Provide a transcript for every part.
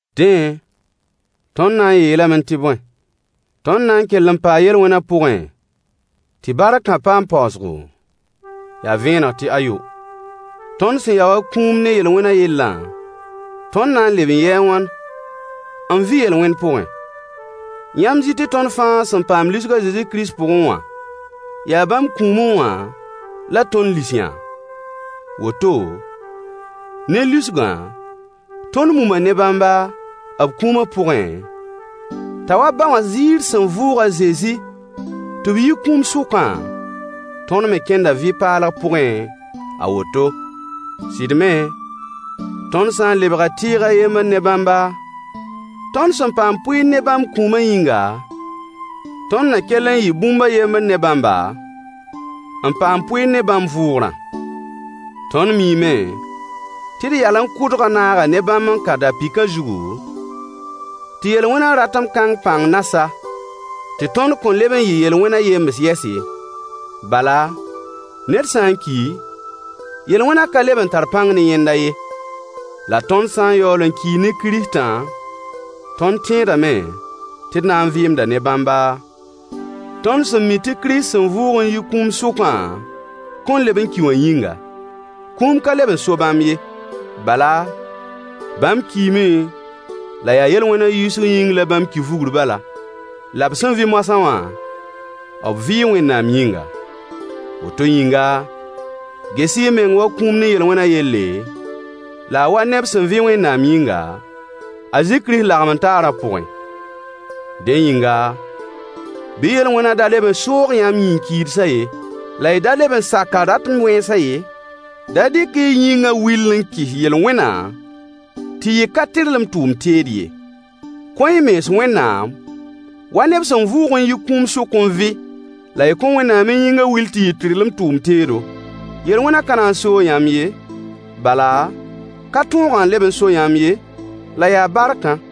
Dẽ, tõnd na n yeelame tɩ bõe? Tõnd na n kell n paa yel-wẽnã pʋgẽ tɩ barkã paam paoosgo? Yaa vẽeneg tɩ ayo. Tõnd sẽn ya wa kũum ne yel-wẽna yellã, tõnd na n leb n yɩɩ a wãn n vɩ yel-wẽn pʋgẽ? Yãmb zɩ tɩ tõnd fãa sẽn paam lisg Kirist Zezi pʋgẽ wã, yaa bãmb kũumẽ wã la tõnd lis-yã? Woto, ne lisgã, tõnd muma ne bãmba b kũumã pʋgẽ, t'a wa ba wã ziir sẽn vʋʋg a Zezi tɩ b yi kũum sʋkã, tõnd me kẽnda vɩ-paalg pʋgẽ a woto. Sɩd me, tõnd sã n lebga tɩɩg a yembr ne bãmba, tõnd sẽn paam pʋɩɩr ne bãmb kũumã yĩnga, tõnd na kell n yɩ bũmb a yembr ne bãmba, n paam pʋɩɩr ne bãmb vʋʋgrã. Tõnd miime tɩ d yalẽ kʋdgã naaga ne bãmb n ka da-pɩkã zugu, tɩ yel-wẽnã ratem kãng pãng na sa, tɩ tõnd kõn leb n yɩ yel-wẽnã yems yɛs ye. Bala, ned sã n ki, yel-wẽnã ka leb n tar pãng ne yẽnda ye. La tõnd sã n yaool n kii ne Kiristã, tõnd tẽedame tɩ d na n vɩɩmda ne bãmba, tõnd sẽn mi tɩ Kirist sẽn vʋʋg n yi kũum sʋkã kõn leb n ki wã yĩnga. Kũum ka leb n so bãmb ye. Bala bãmb kiime, la yaa yel-wẽnã yiisg yĩng la bãmb ki vugr bala. La b sẽn vɩ moasã wã, b vɩɩ Wẽnnaam yĩnga. Woto yĩnga, ges-y y meng wa kũum ne yel-wẽna yelle, la a wa neb sẽn vɩ Wẽnnaam yĩnga, Kirist Zezi lagem-n-taarã pʋgẽ. Dẽ yĩnga, bɩ yel-wẽnã da leb n soog yãmb yĩn-kiidsã ye, la y da leb n sak a ratem wẽnsã ye. Da dɩk-y y yĩngã will n kɩs yel-wẽnã tɩ yɩ ka-tɩrlem tʋʋm teed ye. Kõ-y y mens Wẽnnaam, wa neb sẽn vʋʋg n yi kũum sʋk n vɩ, la y kõ Wẽnnaam y yĩngã wil tɩ yɩ tɩrlem tʋʋm teedo. Yel-wẽnã ka na n soog yãmb ye, bala, ka tõogã n leb n so yãmb ye, la yaa barkã.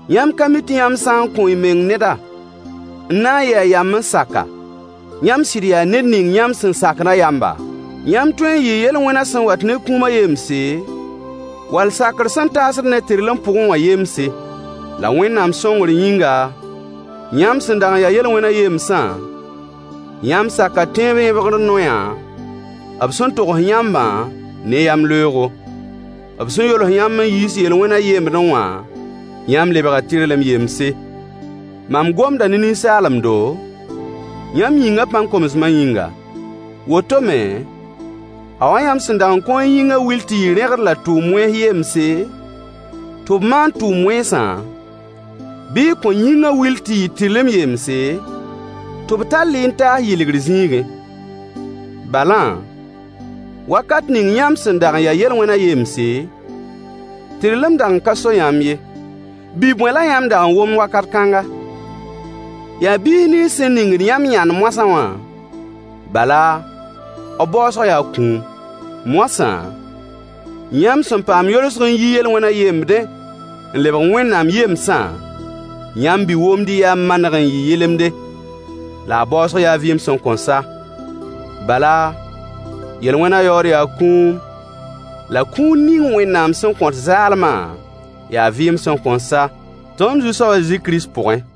Yãmb ka mi tɩ yãmb sã n kõ-y meng neda, n na n yɩ a yamb n sak-a, yãmb sɩd yaa ned ning yãmb sẽn sakdã yamba? Yãmb tõe n yɩɩ yel-wẽnã sẽn wat ne kũumã yemse, wall sakr sẽn taasd ned tɩrlem pʋgẽ wã yemse. La Wẽnnaam sõngr yĩnga, yãmb sẽn dag n ya yel-wẽnã yemsã, yãmb saka tẽeb yẽbgr noyã b sẽn togs yãmbã ne y yamleoogo. B sẽn yols yãmb n yiis yel-wẽnã yembdẽ wã, yãmb lebga tɩrlem yemse. Mam gomda ne ninsaalemdo, yãmb yĩngã pãn-komsmã yĩnga. Woto me, a wa yãmb sẽn dag n kõ y yĩngã wil tɩ yɩ rẽgd la tʋʋm wẽns yemse, tɩ b maan tʋʋm wẽnsã, bɩ y kõ yĩngã wil tɩ yɩ tɩrlem yemse, tɩ b tall-y n taas yɩlgr zĩigẽ. Balã, wakat ning yãmb sẽn dag n ya yel-wẽnã yemse, tɩrlem dag n ka so yãmb ye. Bi-bõe la yãmb dag n womd wakat kãnga? Yaa biis nins sẽn ningd yãmb yãnd moasã wã, bala, b baoosg yaa kũum. Moasã, yãmb sẽn paam yolsg n yi yel-wẽnã yembdẽ n lebg Wẽnnaam yemsã, yãmb bi-womdɩ yaa maneg n yɩ yɩlemde, la a baoosg yaa vɩɩm sẽn kõn sa. Bala, yel-wẽnã yaood yaa kũun, la kũun ning Wẽnnaam sẽn kõt zaalmã yaa vɩɩm sẽn kõn sa, tõnd Zu-soab a Zezi Kirist pʋgẽ.